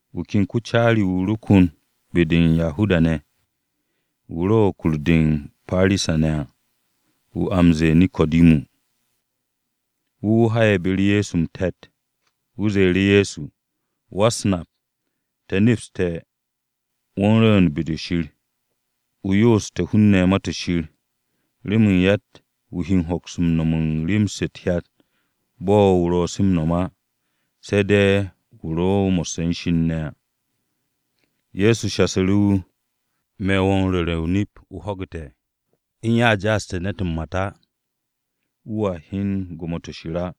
Wu̱ ken ko-caari-wu̱ ro kon be-de u̱n Yahuda-ne̱, wu̱ ro̱ u̱n kur-de u̱n Parisa-ne̱ à, a wu̱ m-ze̱e̱ Neko̱dimu. Wu̱ wu̱ ha'e̱ be-u̱r Ye̱so m-te̱t. Wu̱ ze̱e̱ru̱ Ye̱so, “Wa-u̱s-Nap, te̱ nepste̱, wo̱ u̱n rwu̱u̱n be-de Shir, o yoosu̱te̱ hun-ne̱ Ma-to̱ Shir, remen yatt-wu̱ he hoks-m nom u̱n rem-se u̱t-hyat bo̱ o ro̱ se m-nom á, se̱ de̱ wu̱ ro̱ mo̱sse̱ u̱n Shir ne̱ à.” Ye̱so shasu̱ru̱ wu̱, “Me̱ wo̱ m-ru̱re̱ o-nip, o ho̱gu̱te̱. U̱n ya a ja'aste̱ mat u̱n ne̱t á, wu̱a hyen gwo̱mo-to̱ Shir á.”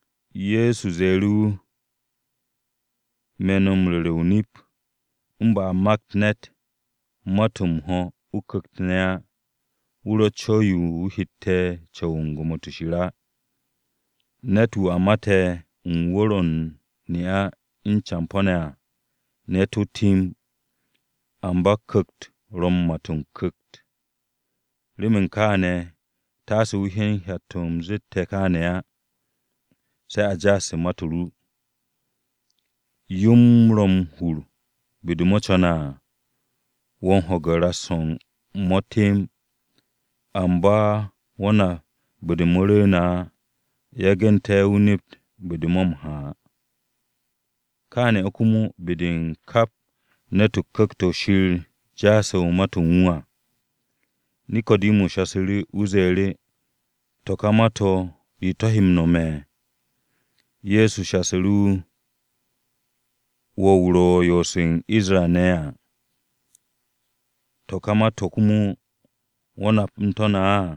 Ye̱so ze̱e̱ru̱ wu̱, “Me̱ wo̱ m-ru̱re̱ o-nip. U̱n ba a makt ne̱t mat-o̱ m-ho̱ o-Ku̱kt ne̱ á, wu̱ ro̱tt co̱w-yo wu̱ hette̱ m-co̱w u̱n gwo̱mo-to̱ Shir á. Ne̱t-wu̱ a mate̱ u̱n wu̱r-o̱ u̱n ne'a u̱n campo̱ ne̱ à, ne̱t-wu̱ temb. Amba Ku̱kt-o ro̱ m-mat o-ku̱kt. Remen kaane̱ taase o hyen hyat-to̱ u̱m zette̱ wo̱ kaane̱ á, ‘Se̱ a ja'aste̱ mat-o ru.’ Yo-m ro̱ m-hur be-de mo̱ co̱ne̱ à. Wo̱ m-ho̱ge̱ ras-o̱ u̱n mo̱ temb, amba wo̱ nap be-de mo̱ rwu̱u̱ne̱ á, yagu̱nte̱ o nept be-de mo̱ ro̱ m-ha à. Kaane̱ o̱ komo be-de u̱n kap ne̱t-wu̱ Ku̱kt-o̱ Shir ja'ase̱ mat-o̱ u̱n wu̱ à.” Neko̱dimu shasu̱ru̱, wu̱ ze̱e̱ru̱, “To̱ ka ma-to̱, ¿re o̱ to̱ he m-nome̱?” Ye̱so shasu̱ru̱ wu̱, “Wo̱ wu̱ ro̱ m-yoose̱ u̱n Isra-ne̱ à, to̱ ka ma-to̱ komo, ¿wo̱ nap u̱n to̱ ne̱ á?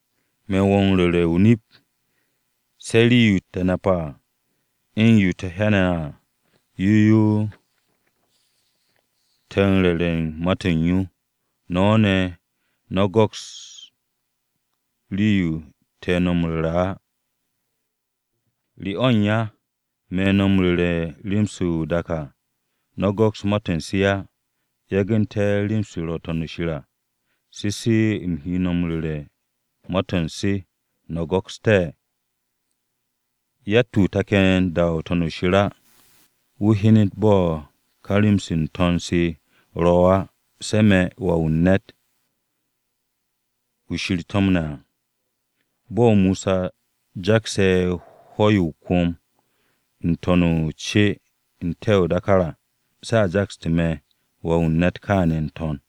Me̱ wo̱ m-ru̱re̱ o-nip. Se̱ rii-yo te̱ nape̱ à, u̱n yo te̱ hyane̱ ne̱ à, yo yo te̱ no̱ m-ru̱re̱ u̱n ma-to̱ u̱n yo. No̱ ne̱, no̱ m-go̱ks u̱n rii-yo te̱ no̱ m-ru̱re̱ á. ¿Re o̱ u̱n ya? Me̱ no̱ m-ru̱re̱ rem-se ro̱ n-dak à, no̱ go̱ks ma-to̱ u̱n se á. Yagu̱nte̱ rem-se ro̱ u̱n To̱n-o̱ shir à, se se u̱m he no̱ m-ru̱re̱ ma-to̱ u̱n se, no̱ go̱kste̱? Yatt-wu̱ take̱ m-da n-To̱n u̱n shir á, wu̱ hyenet bo̱ ka rem-se n-To̱n se ro̱ á, se̱ me̱ Wà-wu̱ u̱n ne̱t, wu̱ Shir to̱mne̱ à. Bo̱ Mosa jakse̱ hwo̱-yo o-kwo̱m n-to̱n o-ce n-te̱ o-dákár à, se̱ a jakste̱ me̱ Wà-wu̱ u̱n ne̱t kaane̱ n-to̱n.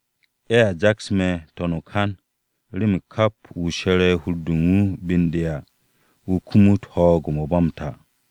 Ye̱a jaks me̱ n-to̱n o-kan, remen kap wu̱ she̱re̱ hur-de u̱n wu̱ be u̱n de à, wu̱ kumut ho̱o̱g-mo̱ ba m-ta.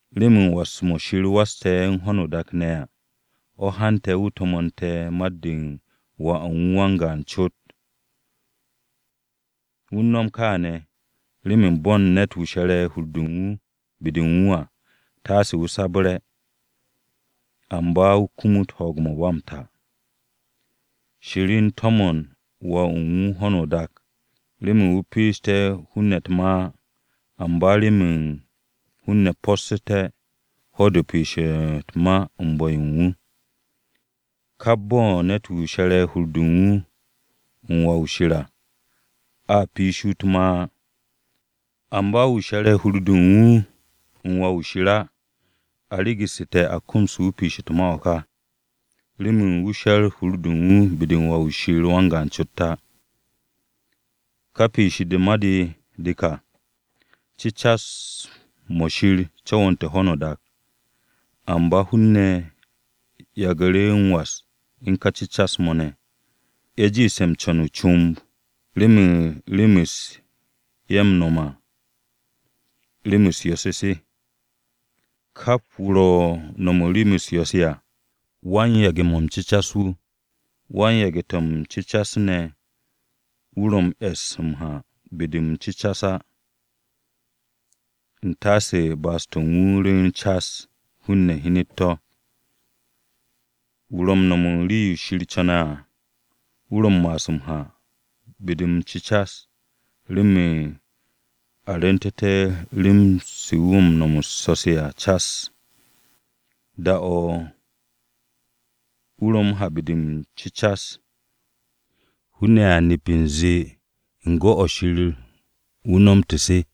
“Remen was-mo̱ Shir wasse̱ u̱n ho̱no o-dak ne̱ à, o̱ hante̱ wu̱ to̱mo̱nte̱ mat-de u̱n Wà u̱n wu̱ wan-gaan cot. Wu̱ u̱n no̱m kaane̱, remen bo̱ u̱n ne̱t-wu̱ she̱re̱ hur-de u̱n wu̱ be-de u̱n wu̱ à, taase wu̱ sabre̱, amba wu̱ kumut ho̱o̱g-mo̱ ba m-ta. Shir u̱n to̱mo̱n Wà u̱n wu̱ ho̱no o-dak, remen wu̱ piishité̱ hun-ne̱ u̱t-ma á, amba remen hun-ne̱ possu̱té̱ ho̱-de u̱n piish u̱t-ma u̱n bu̱-yo u̱n wu̱. Kap bo̱ u̱n ne̱t-wu̱ she̱re̱ hur-de u̱n wu̱ u̱n Wà-wu̱ Shir à, a piishi wu̱ u̱t-ma á. Amba wu̱ she̱re̱ hur-de u̱n wu̱ u̱n Wà-wu̱ Shir á, a regu̱su̱te̱ a komsu̱te̱ wu̱ piishe̱ u̱t-ma o̱ ka, remen wu̱ she̱r hur-de u̱n wu̱ u̱n Wà-wu̱ Shir wan-gaan cot á. Ká piish-de u̱t-ma de de kà: Cecas-mo̱ Shir co̱wo̱nte̱ u̱n ho̱no o-dak, amba hun-ne̱ yagu̱ru̱ m-was u̱n ka cecas-mo̱ ne̱. Ye̱ jiishte̱ m-co̱n o-comb, remen rem-se ye̱ ro̱ m-no̱m à, rem-u̱s yo̱-se se. Kap wu̱ ro̱ m-no̱m u̱n rem-u̱s yo̱-se à, wan-yage̱ to̱ m-cecas wu̱. Wan-yage̱ to̱ m-cecas ne̱, wu̱ ro̱ m-e̱s m-ha be-de m-cecas á, u̱n taase ba'as-to̱ u̱n wu̱ rwu̱u̱n cas, hun-ne̱ hyen to̱. Wu̱ ro̱ m-no̱m u̱n rii-yo Shir co̱ne̱ à, wu̱ ro̱ m-ma'as m-ha be-de m-cecas, remen a rwu̱ntu̱te̱ rem-se u̱n wu̱ u̱s-so̱-se cas. Da-o̱ wu̱ ro be-de m-cecas, hun-ne̱ a nep u̱nze u̱n gwu̱-o̱ Shir o̱ wu̱ nomte̱ se.”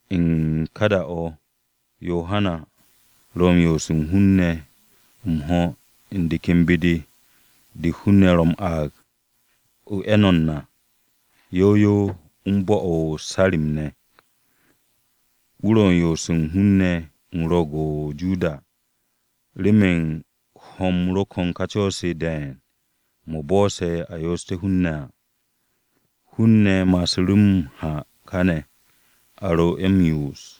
U̱n ka da-o̱ Yohana ro m-yo'os u̱n hun-ne̱ m-ho̱ u̱n de ken be-de de hun-ne̱ ro̱ m-aag o-Eno̱n à yow yow u̱n bo̱-o̱ o-Sarim ne̱. Wu̱ ro̱ u̱n yo'os u̱n hun-ne̱ u̱n Ro̱o̱g-o̱ o-Joda remen ho̱-m ro̱ ko̱n ka co̱-se ne̱ de̱e̱n mo̱ bo̱'o̱se̱ yo'os u̱n hun-ne̱ à. Hun-ne̱ ma'asu̱ru̱ m-ha káne̱, a ro ye̱ m-yo'os.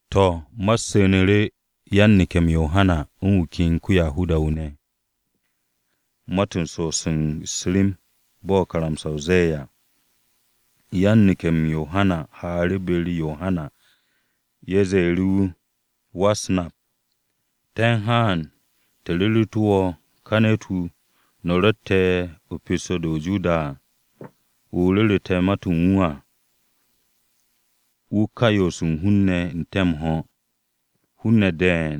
To̱, ma-u̱t su̱nu̱ru̱ yan-neke̱-m Yohana u̱n wu̱ ken ko-Yahuda-wu̱ ne̱, ma-to̱ u̱n so'os u̱s-rem bo̱ karamsa-o ze̱e̱ à. Yan-neke̱-m Yohana haaru̱ be-u̱r Yohana. Ye̱ ze̱e̱ru̱ wu̱, “Wa-u̱s-Nap, te̱ u̱n haan, te̱ ru̱ru̱tu̱ wo̱ ka ne̱t-wu̱, wu̱ no̱ rotte̱ pesto-de o-Joda à, wu̱ o ru̱ru̱ te̱ ma-to̱ u̱n wu̱ à, wu̱ ka u̱n yo'os u̱n hun-ne̱ n-te̱ m-ho̱. Hun-ne̱ de̱e̱n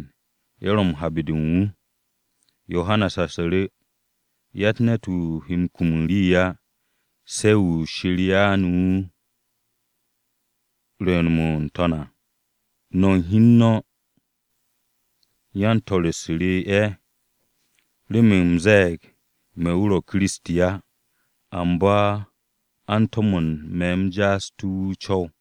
ye̱ ro̱ m-ha be-de u̱n wu̱.” Yohana shasu̱ru̱, “Yatt ne̱t-wu̱ he kum u̱n rii á, se̱ yo Shir ya'anu̱ wu̱ rwu̱u̱n-mo̱ n-To̱n à. No̱ u̱n hi u̱n no̱ yan-swo̱-u̱s re ye̱, remen u̱m ze̱e̱g, ‘Me̱ wu̱ ro̱ Kiristi á, amba a u̱n to̱mo̱n me̱ u̱m ja'asu̱té̱ wu̱ o-co̱w.’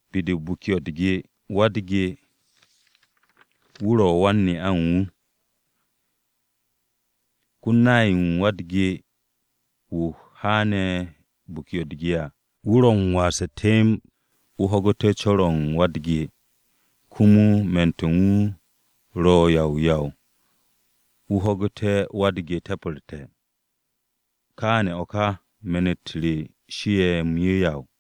Be-de u̱n biki-o̱ u̱r-ge, wa-u̱r-ge-wu̱ ro̱ wan-ne'a u̱n wu̱. Ko-nay-wu̱ u̱n wa-u̱r-ge-wu̱ haane̱ biki-o̱ u̱r-ge à wu̱ ro̱ m-wase̱ temb wu̱ ho̱gu̱te̱ co̱r-o̱ u̱n wa-u̱r-ge. Komo me̱n-to̱ u̱n wu̱ ro̱ yaw yaw wu̱ ho̱ge̱ wa-u̱r-ge te̱pe̱rte̱. Kaane̱ o̱ ka me̱n-u̱t re shie̱ m-yeyaw.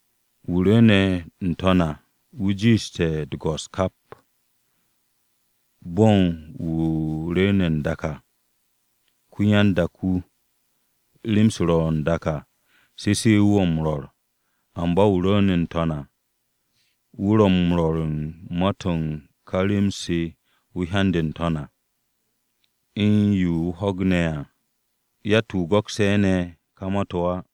“Wu̱ rwu̱u̱ne̱ n-To̱n à, wu̱ jiishe̱ u̱t-go̱s kap. Bo̱ u̱n wu̱ rwu̱u̱ne̱ n-dak à ko-ya-n-dak-wu̱, rem-se ro̱ n-dak à, se se wu̱ ro̱ m-rwo̱r. Amba wu̱ rwu̱u̱ne̱ n-To̱n à, wu̱ ro̱ m-rwo̱r u̱n ma-to̱ u̱n ka rem-se wu̱ hyande̱ n-To̱n à, u̱n yo wu̱ ho̱gne̱ ne̱ à. Yatt-wu̱ go̱kse̱ ne̱ ka ma-to̱ á.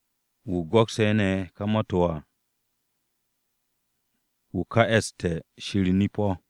Wu̱ go̱kse̱ ne̱ ma-to̱ u̱n wu̱ à, wu̱ ka e̱ste̱ Shir nip-o̱.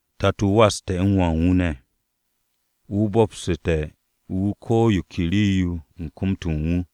Tato-o waste̱ u̱n Wà u̱n wu̱ ne̱. Wu̱ bo̱psu̱te̱ wu̱ ko̱ yo ke rii-yo u̱n kom-to̱ u̱n wu̱.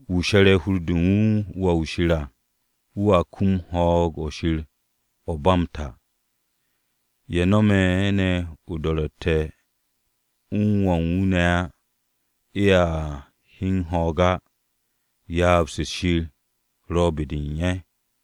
Wu̱ she̱re̱ hur-de u̱n wu̱ u̱n Wà-wu̱ Shir à, wu̱a kum ho̱o̱g-o̱ Shir o̱ ba m-ta. Ye̱ no̱me̱ ne̱ o-do̱ro̱tte̱ u̱n ka Wà-wu̱ ne̱ á, ye̱a hyen ho̱o̱g á, ryaab-se Shir ro̱ be-de u̱n ye̱.”